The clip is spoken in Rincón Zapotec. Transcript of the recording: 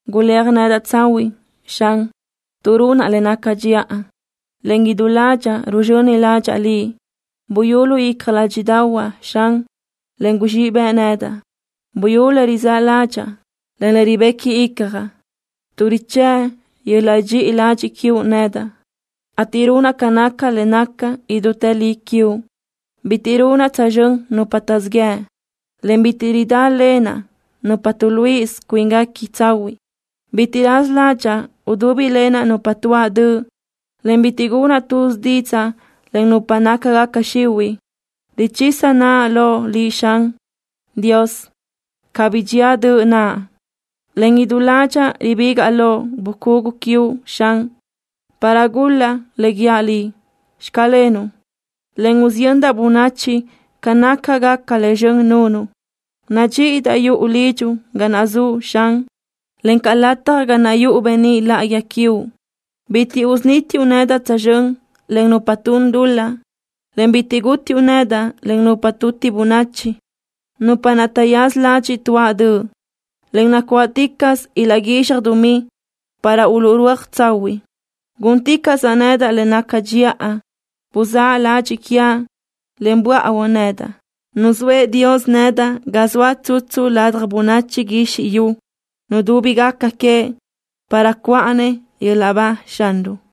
Guléaj nedaʼ tsahuiʼ, Xan, tuʼ runaʼ le naca dxiʼa, en idú ládxaʼa ruzxöni ládxaʼa Liʼ. Buyú lu icja ládxiʼdaʼahuaʼ, Xan, en guzxíʼ bëʼ nedaʼ. Buyú le rizáʼ ládxaʼa, en le ribequi icjaʼ, tuʼ richë́ʼ yöl-laʼ dxiʼi ladxiʼ quiuʼ nedaʼ, ateʼ runaʼ ca naca le naca idútë li quiuʼ. Bitiʼ runaʼ tsözxö́n nupa taʼzíʼ yëʼ, en bitiʼ ridálenaʼ nupa tuʼluíʼisö cuínguequi tsahuiʼ. Bitiʼ raza ládxaʼa udúbilenaʼ nupa tuáʼ döʼ, en bitiʼ gunaʼ tuz didzaʼ len nupa nácagaca xihuiʼ. Richisa naʼa loʼ Liʼ, Dios, cabí dxía döʼ naʼa, en idú ládxaʼa ribígaʼa lo bucugu quiuʼ, Xan, para gul-laʼ le guíaʼ Liʼ: “Xclenuʼ” en usiyöndaʼ bönachi ca nácagaca le zxön nunuʼ. Nadxíʼidaʼ yuʼu lidxuʼ ga naʼ zuʼ, Xan, encaʼ lataj ga naʼ yuʼu beníʼ láʼayi quiuʼ. Bitiʼ usunítiuʼ nedaʼ tsözxö́n len nupa tun dul-laʼ, en bitiʼ gútiuʼ nedaʼ len nupa tuti bönachi, nupa naʼ taʼyaza ladxiʼ tuáʼ döʼ, en nacuáʼticaʼsö ilaʼguizxaj dumí para uluʼrúaj tsahuiʼ. Gúnticaʼsaʼ nedaʼ le naca dxiʼa. Buzáʼ ladxiʼ quiaʼ, en buáʼuö nedaʼ. Nuzóëʼ Dios nedaʼ ga zoaʼ tsutsu ladja bönachi guizxi yu nudúbigaca queëʼ para cuʼa-nëʼ yöl-laʼ ba Xanruʼ.